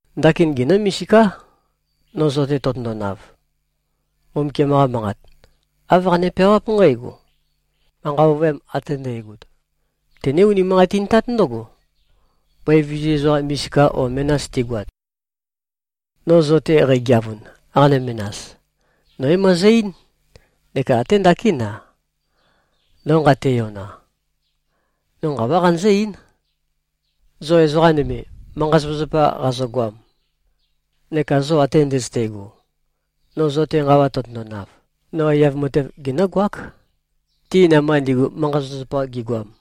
Ndakin genǿ-misiká, no zo-te tøtøndonav. Mbumbukiam-qa Manqat, āv qane-peawáp nqǽgo, “Manqa ovøyam ate ndægot, tøné-unimanqatintát ndǿgo, bøi vizu ezoqa misika o menas tigoat.” No zo-te qægeavun, qanø-menas, no é-møezø-eín, neka até ndakín-a, no nqateyona, no nqawá qanøzǿ-eín, zo ezoqa nøme, manqa-zapazapa qazogoam neka zo ate ndøzøte꞉go: No zo-te nqawa tøtøndonav, no aiyav matev genǿgoák, ti namba ndigu, manqa-zapazapa gigoam.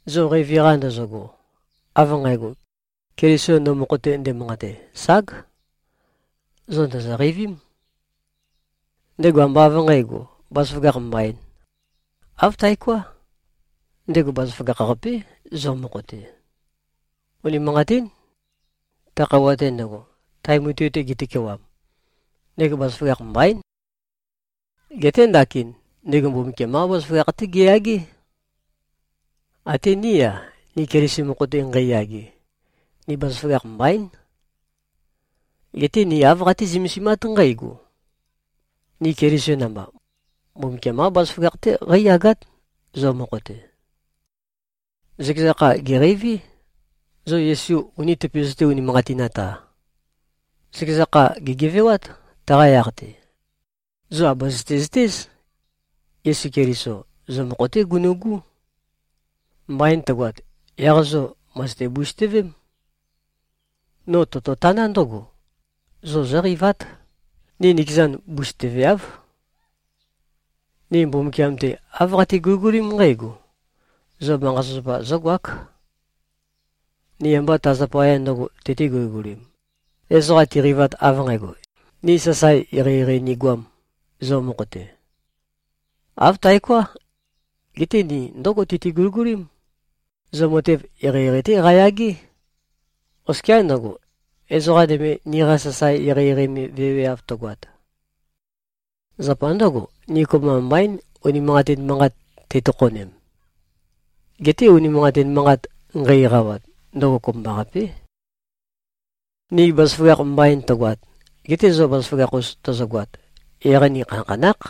Zo qeivi-qa ndozogo, av nqægo, Keliso no mokho-te ndemanqate, ság, zo ndòzo-qeivím. Ndego ambá av nqǣgo, bazaføgakh mbaīn. Āv taoká. Ndego bazaføgakh-qapé, zo mokho-te. Unimanqatín. Ta khøuwa-te ndøgo, tae mutui-te getøkewam, ndego bazaføgakh mbaín. Geté ndakin, ndego Mbumbukiam-qá bazaføgakh-té geyagé. Até ní-a, ni Keliso mokho-te nqeiyage, ni bazaføgakh mbaín. Geté ni āv qatí-zømesimát nqǽgo: Ni Keliso namba, Mbumbukiam-qá bazaføgakh-té qeíyagát, zo mokho-te. Zøkeza kha gèqeiví, zo Yesu uni tøpøzøté-unimanqatinat-a. Zøkeza kha gègevewát, taqa yaq-te. Zo àbøzøte-zøtéz. Yesu Keliso, zo mokho-té gunu꞉gú. Mbain tøgoat, yaq zo mø̀zøte-busøtøvém. No tototaná ndǿgo: Zo zóqeivát. Ni nikezan, busøtøveáv. Ni Mbumbukiam-te, āv qati-guligulím nqǽgo: Zo manqa-zapazapa zógoák. Ni ambá ta zapaya ndø̄go tøti-guligulīm, ezoqa tiqeivat av nqægo, ni sasae eqeieqei nigoām, zo mokho-te. Āv taoká. Geté ni ndǿgo tøti-guligulím: Zo matev eqeieqei-té qayagé. Oskiá ndøgo, ezoqa nøme niqa sasae eqeieqei me veweav tøgoat. Zapa ndǿgo, ni kopømba mbaín, unimanqatin manqat tei-tokhonem. Geté unimanqatin manqat nqei-eqawat, ndøgo kopømbaqapé. Ni bazaføgakh mbain tøgoat, gete zo bazaføgakh-us tozogoat, yaq ni khanakhanákh.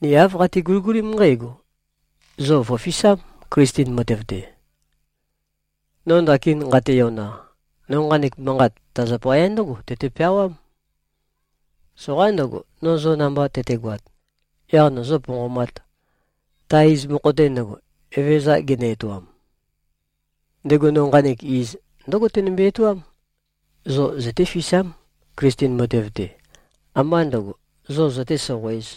Ni āv qati-guligulím nqǽgo: Zo vø̀fisám, Klisten matev-te. No ndakin nqateyona, no nqanek manqat ta zapaya ndǿgo tøte-peawám: Soqaín ndøgo, no zo namba tøtegoat, yaq nøzø̄-ponqomāt, ta iz mokho-te ndøgo, Evezøza genø-etoam. Ndego no nqanek iz, ndǿgo tenømbe-etoám: Zo zøtéfisám, Klisten matev-te, ambá ndøgo, zo zøté-soqoēz.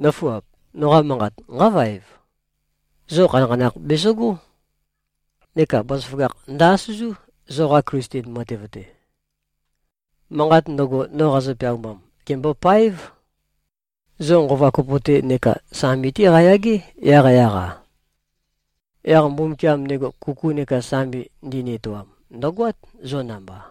Nǿfuap! Noqa manqat nqá-vaev. Zo khanakhanakh bezøgó. Neka bazaføgakh ndø-asøzú, zoqa Klisten matev-te. Manqat ndøgo, no qazø-peaumam, gèmbopáev. Zo nqova kopo-té neka sambi-té qayagé, yaqyaq-a. Yaq Mbumbukiam, ndego kuku neka sambi ndini-etoam, ndø̀goát, zo namba.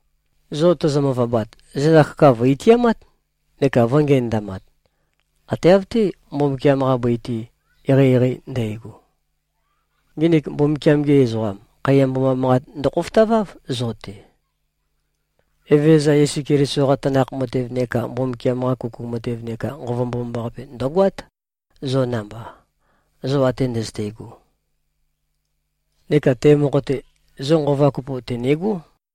Zo tozo-møvabat, zenda kaka vø̀-itiamát neka vø̄ngenøndamat, ate av-té, Mbumbukiam-qa bøi-te eqeieqei ndægo. Nginik Mbumbukiam-gi ezoqam, khaiya mboma manqat ndøkhofotaváv zo-te. Evezøza Yesu Keliso-qa tanakh matev neka Mbumbukiam-qa kuku matev neka Nqova Mbomambaqape, ndø̀goát, zo namba, zo ate ndøzøte꞉go. Neka te mokho-te, zo nqova kopo tø̀negó.